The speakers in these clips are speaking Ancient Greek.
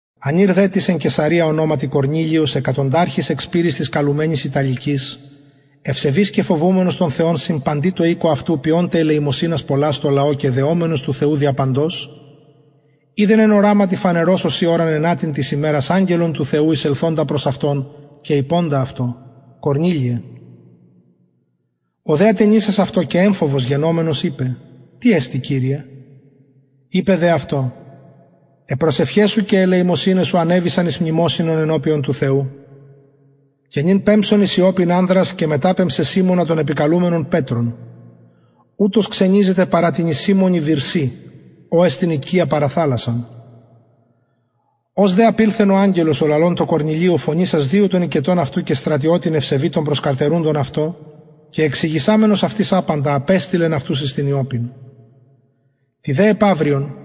ανηρ δε τις ην εν καισαρεια ονοματι κορνηλιος εκατονταρχης εκ σπειρης της καλουμενης ιταλικης ευσεβης και φοβουμενος τον θεον συν παντι τω οικω αυτου ποιων τε ελεημοσυνας πολλας τω λαω και δεομενος του θεου δια παντος ειδεν εν οραματι φανερως ωσει ωραν ενατην της ημερας αγγελον του θεου εισελθοντα προς αυτον και ειποντα αυτω κορνηλιε ο δε ατενισας αυτω και εμφοβος γενομενος ειπεν τι εστιν κυριε ειπεν δε αυτω αι προσευχαι σου και αι ελεημοσυναι σου ανεβησαν εις μνημοσυνον ενωπιον του θεου και νυν πεμψον εις ιοππην ανδρας και μεταπεμψαι σιμωνα τον επικαλουμενον πετρον ουτος ξενιζεται παρα τινι σιμωνι βυρσει ω εστιν οικια παρα θαλασσαν ως δε απηλθεν ο αγγελος ο λαλων τω κορνηλιω φωνησας δυο των οικετων αυτου και στρατιωτην ευσεβη των προσκαρτερουντων αυτω και εξηγησαμενος αυτοις απαντα απεστειλεν αυτους εις την ιοππην τη δε επαυριον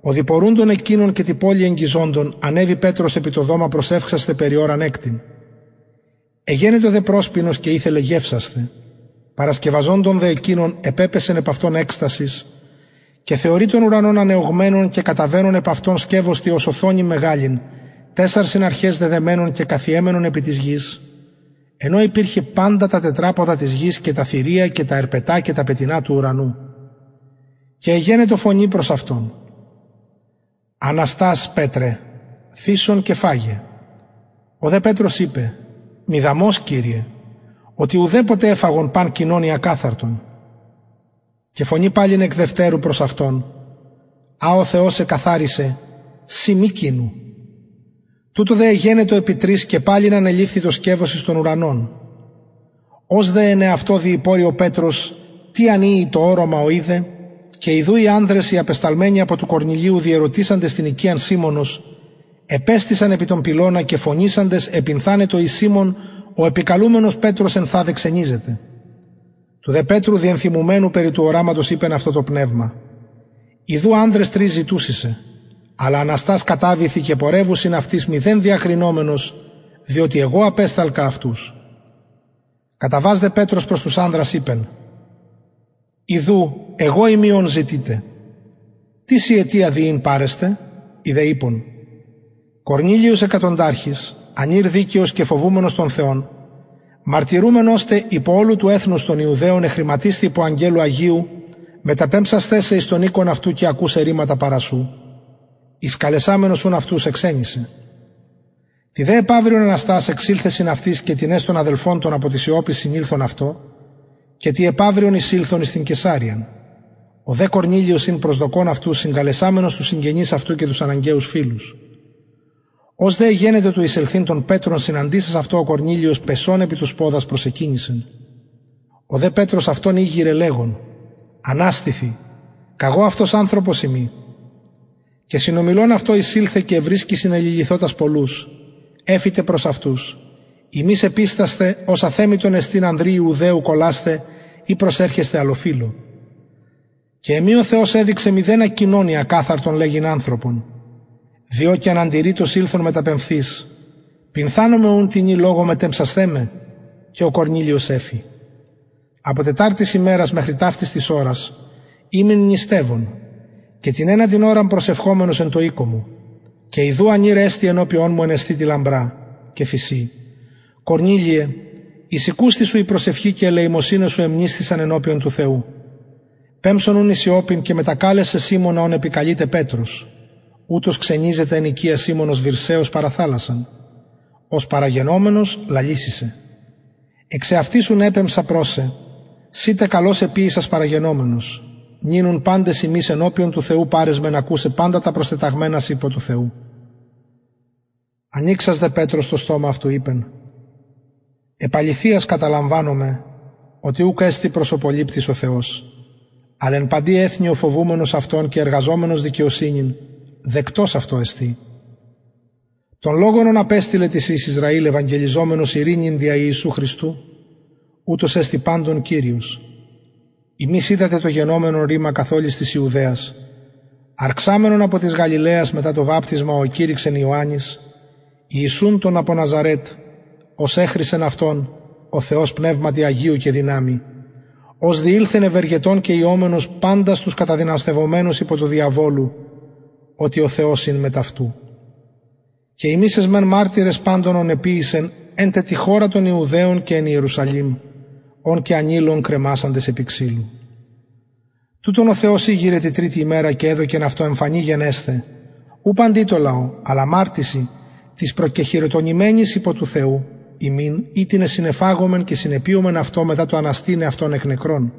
οδοιπορουντων εκεινων και τη πολει εγγιζοντων ανεβη πετρος επι το δωμα προσευξασθαι περι ωραν εκτην εγενετο δε προσπεινος και ηθελεν γευσασθαι παρασκευαζοντων δε εκεινων επεπεσεν επ αυτον εκστασις και θεωρει τον ουρανον ανεωγμενον και καταβαινον επ αυτον σκευος τι ως οθονην μεγαλην τεσσαρσιν αρχαις δεδεμενον και καθιεμενον επι της γης εν ω υπηρχεν παντα τα τετραποδα της γης και τα θηρια και τα ερπετα και τα πετεινα του ουρανου και εγενετο φωνη προς αυτον αναστας πετρε θυσον και φαγε ο δε πετρος ειπεν μηδαμως κυριε οτι ουδεποτε εφαγον παν κοινον η ακαθαρτον και φωνη παλιν εκ δευτερου προς αυτον α ο θεος εκαθαρισεν συ μη κοινου τουτο δε εγενετο επι τρις και παλιν ανεληφθη το σκευος εις τον ουρανον ως δε εν εαυτω διηπορει ο πετρος τι αν ειη το οραμα ο ειδεν και ιδου οι ανδρες οι απεσταλμενοι απο του κορνηλιου διερωτησαντες την οικιαν σιμωνος επεστησαν επι τον πυλωνα και φωνησαντες επυνθανοντο ει σιμων ο επικαλουμενος πετρος ενθαδε ξενιζεται του δε πετρου διενθυμουμενου περι του οραματος ειπεν αυτω το πνευμα ιδου ανδρες ζητουσιν σε αλλα αναστας καταβηθι και πορευου συν αυτοις μηδεν διακρινομενος διοτι εγω απεσταλκα αυτους καταβας δε πετρος προς τους ανδρας ειπεν ιδου εγω ειμι ον ζητειτε τις η αιτια δι ην παρεστε οι δε ειπον κορνηλιος εκατονταρχης ανηρ δικαιος και φοβουμενος τον θεον μαρτυρουμενος τε υπο ολου του εθνους των ιουδαιων εχρηματισθη υπο αγγελου αγιου μεταπεμψασθαι σε εις τον οικον αυτου και ακουσαι ρηματα παρα σου εισκαλεσαμενος ουν αυτους εξενισεν τη δε επαυριον ο πετρος εξηλθεν συν αυτοις και τινες των αδελφων των απο ιοππης συνηλθον αυτω και τη επαυριον εισηλθον εις την καισαρειαν ο δε κορνηλιος ην προσδοκων αυτους συγκαλεσαμενος τους συγγενεις αυτου και τους αναγκαιους φιλους ως δε εγενετο του εισελθειν τον πετρον συναντησας αυτω ο κορνηλιος πεσων επι τους ποδας προσεκυνησεν ο δε πετρος αυτον ηγειρεν λεγων αναστηθι καγω αυτος ανθρωπος ειμι και συνομιλων αυτω εισηλθεν και ευρισκει συνεληλυθοτας πολλους εφη τε προς αυτους υμεις επιστασθε ως αθεμιτον εστιν ανδρι ιουδαιω κολλασθαι η προσερχεσθαι αλλοφυλω και εμοι ο θεος εδειξεν μηδενα κοινον η ακαθαρτον λεγειν ανθρωπον διο και αναντιρρητως ηλθον μεταπεμφθεις πυνθανομαι ουν τινι λογω μετεπεμψασθε με και ο κορνηλιος εφη απο τεταρτης ημερας μεχρι ταυτης της ωρας ημην νηστευων και την ενατην ωραν προσευχομενος εν τω οικω μου και ιδου ανηρ εστη ενωπιον μου εν εσθητι λαμπρα και φησιν κορνηλιε εισηκουσθη σου η προσευχη και αι ελεημοσυναι σου εμνησθησαν ενωπιον του θεου πεμψον ουν εις ιοππην και μετακαλεσαι σιμωνα ος επικαλειται πετρος ουτος ξενιζεται εν οικια σιμωνος βυρσεως παρα θαλασσαν ος παραγενομενος λαλησει σοι εξαυτης ουν επεμψα προς σε συ τε καλως εποιησας παραγενομενος νυν ουν παντες ημεις ενωπιον του θεου παρεσμεν ακουσαι παντα τα προστεταγμενα σοι υπο του θεου ανοιξας δε πετρος το στομα ειπεν επ αληθειας καταλαμβανομαι οτι ουκ εστιν προσωποληπτης ο θεος αλλ εν παντι εθνει ο φοβουμενος αυτον και εργαζομενος δικαιοσυνην δεκτος αυτω εστιν τον λογον ον απεστειλεν τοις υιοις ισραηλ ευαγγελιζομενος ειρηνην δια ιησου χριστου ουτος εστιν παντων κυριος υμεις οιδατε το γενομενον ρημα καθ ολης της ιουδαιας αρξαμενον απο της γαλιλαιας μετα το βαπτισμα ο εκηρυξεν ιωαννης ιησουν τον απο ναζαρετ ως εχρισεν αυτον ο θεος πνευματι αγιω και δυναμει ος διηλθεν ευεργετων και ιωμενος παντας τους καταδυναστευομενους υπο του διαβολου οτι ο θεος ην μετ αυτου και ημεις εσμεν μαρτυρες παντων ων εποιησεν εν τε τη χωρα των ιουδαιων και εν ιερουσαλημ ον και ανειλον κρεμασαντες επι ξυλου τουτον ο θεος ηγειρεν τη τριτη ημερα και εδωκεν αυτον εμφανη γενεσθαι ου παντι τω λαω αλλα μαρτυσιν τοις προκεχειροτονημενοις υπο του θεου ημιν οιτινες συνεφαγομεν και συνεπιομεν αυτω μετα το αναστηναι αυτον εκ νεκρων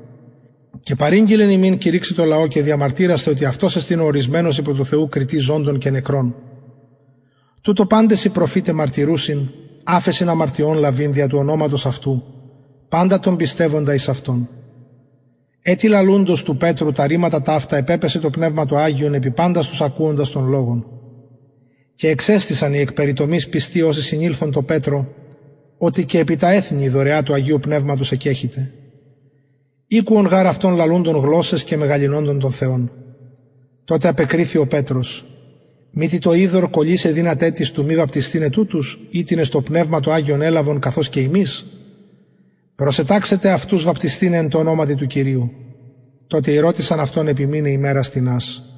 και παρηγγειλεν ημιν κηρυξαι τω λαω και διαμαρτυρασθαι οτι αυτος εστιν ο ωρισμενος υπο του θεου κριτης ζωντων και νεκρων τουτω παντες οι προφηται μαρτυρουσιν αφεσιν αμαρτιων λαβειν δια του ονοματος αυτου παντα τον πιστευοντα εις αυτον ετι λαλουντος του πετρου τα ρηματα ταυτα επεπεσεν το πνευμα το αγιον επι παντας τους ακουοντας τον λογον και εξεστησαν οι εκ περιτομης πιστοι οσοι συνηλθον τω πετρω οτι και επι τα εθνη η δωρεα του αγιου πνευματος εκκεχυται ηκουον γαρ αυτων λαλουντων γλωσσαις και μεγαλυνοντων τον θεον τοτε απεκριθη ο πετρος μητι το υδωρ κωλυσαι δυναται τις του μη βαπτισθηναι τουτους οιτινες το πνευμα το αγιον ελαβον καθως και ημεις προσεταξεν τε αυτους βαπτισθηναι εν τω ονοματι του κυριου τοτε ηρωτησαν αυτον επιμειναι ημερας τινας